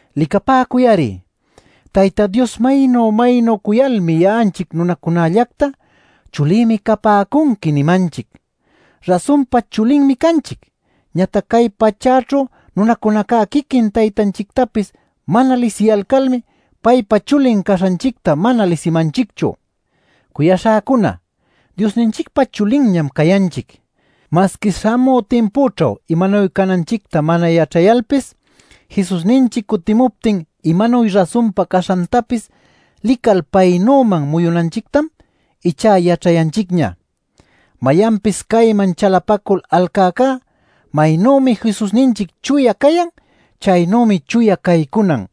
¡Licapäcuy-ari, Tayta Dios maynu-maynu cuyalmi ya'anchic nunacunallacta “Chulïmi capäcunqui” nimanchic! ¡Rasunpa chulinmi canchic! Ñatac cay pachäćhu nunacunaca quiquin Taytanchictapis mana lisiyalcalmá paypa chulin caśhanchicta mana lisimanchicchu. Cuyaśhäcuna, Diosninchicpa chulinñam cayanchic. Masqui śhamü timpućhu imanuy cananchicta mana yaćhayalpis, Jesusninchic cutimuptin imanuy rasunpa caśhantapis lical paynüman muyunanchictam ichá yaćhayanchicña. Mayanpis cayman chalapacul alcäcá maynümi Jesusninchic chuya cayan, chaynümi chuya caycunan.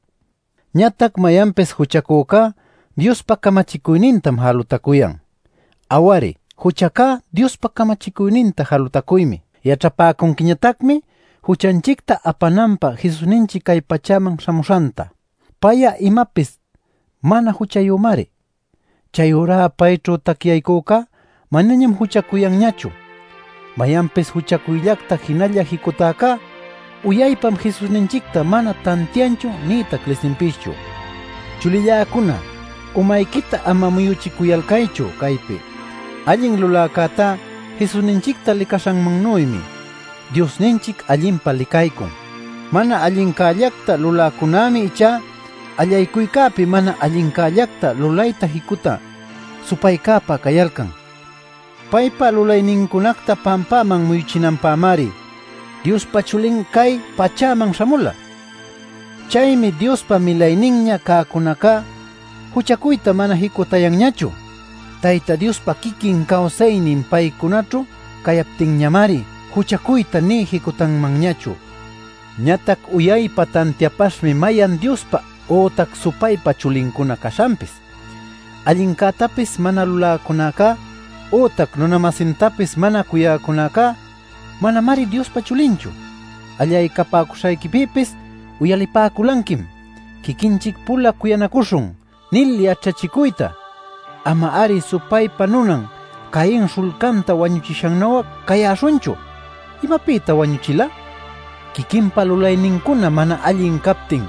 Ñatac mayanpis juchacücá Diospa camachicuynintam jalutacuyan. Aw-ari, juchacá Diospa camachicuyninta jalutacuymi. Yaćhapäcunquiñatacmi juchanchicta apananpä Jesusninchic cay pachäman śhamuśhanta. Pay'a imapis mana juchayümari. Chayurá payćhu tacyaycücá manañam juchacuyanñachu. Mayanpis juchacuyllacta jinalla jicutäcá, uyaypam Jesusninchicta mana tantianchu nïtac lisinpischu. Chulilläcuna, umayquita ama muyuchicuyalcaychu caypi: allin luläcätá Jesusninchicta licaśhannuymi Diosninchic allinpa licaycun. Mana allincällacta luläcunämi ichá allaycuycäpi mana allincällacta lulayta jicutä supaycäpa cayalcan. Paypa lulaynincunacta pampaman muyuchinanpämari Diospa Chulin cay pachäman śhamula. Chaymi Diospa milayninña cäcunacá juchacuyta mana jicutayanñachu; Tayta Diospa quiquin cawsaynin paycunaćhu cayaptinñamari juchacuyta nï jicutanmanñachu. Ñatac uyaypa tantiapaśhmi mayan Diospa ütac supaypa chulincuna caśhanpis: allincätapis mana luläcunacá, ütac nuna-masintapis mana cuyäcunacá manamari Diospa chulinchu. Allaycapäcuśhayquipïpis uyalipäculanquim: “Quiquinchic-pula cuyanacuśhun” nil yaćhachicuyta. Ama-ari supaypa nunan Cain śhullcanta wañuchïcänu'a cayäśhunchu. ¿Imapïtan wañuchila? Quiquinpa lulaynincuna mana allin captin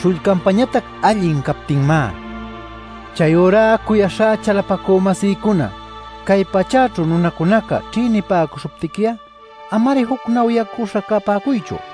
śhullcanpañatac allin captinmá. Chayurá cuyaśhá chalapacü-masïcuna, cay pachäćhu nunacunaca ćhïnipäcuśhuptiqui'a ama-ari jucnawyacüśha capäcuychu.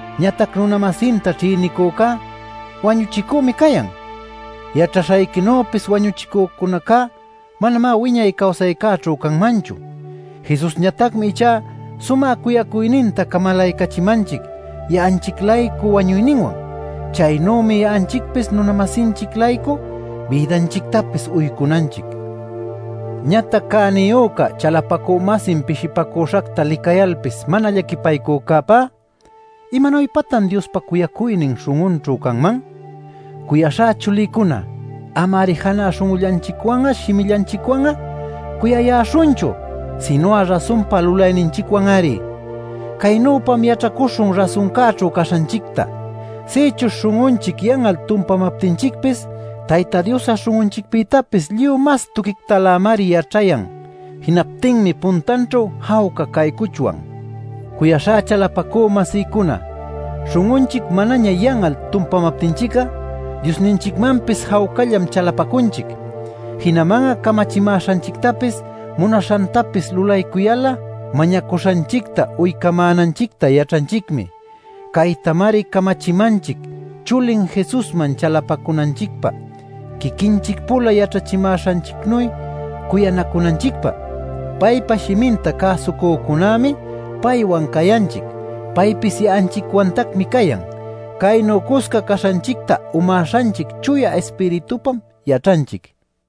Ñatac nuna-masinta ćhïnicücá wañuchicümi cayan. Yaćhaśhayquinüpis wañuchïcunacá manamá wiñay cawsaycäćhu canmanchu. Jesusñatacmi ichá sumä cuyacuyninta camalaycachimanchic ya'anchic-laycu wañuyninwan. Chaynümi ya'anchicpis nuna-masinchic-laycu bïdanchictapis uycunanchic. Ñatac cäniyüca chalapacü-masin pishipacüśhacta licayalpis mana llaquipaycücäpá ¿imanuypatan Diospa cuyacuynin śhun'unćhu canman? Cuyaśhá chulïcuna, ama-ari janä śhun'ullanchicwan'a shimillanchicwan'a cuyayäśhunchu, sinu'a rasunpa lulayninchicwan-ari. Caynüpam yaćhacuśhun rasuncäćhu caśhanchicta. Sïchuśh śhun'unchic yan'al tumpamaptinchicpis Tayta Dios'a śhun'unchicpïtapis lluy mas tuquictalämari yaćhayan. Jinaptinmi puntanćhu jawca caycuchwan. Cuyaśhá chalapacü-masïcuna, śhun'unchic manaña yan'al tumpamaptinchic'a, Diosninchicmanpis jawcallam chalapacunchic. Jinaman'a camachimäśhanchictapis munaśhantapis lulaycuyal'a mañacuśhanchicta uycamänanchicta yaćhanchicmi. Caytamari camachimanchic: chulin Jesusman chalapacunanchicpä, quiquinchic-pula yaćhachimäśhanchicnuy cuyanacunanchicpä. Paypa shiminta cäsucücunämi paywan cayanchic. Paypis ya'anchicwantacmi cayan. Caynu cusca caśhanchicta umäśhanchic Chuya Ispiritupam yaćhanchic.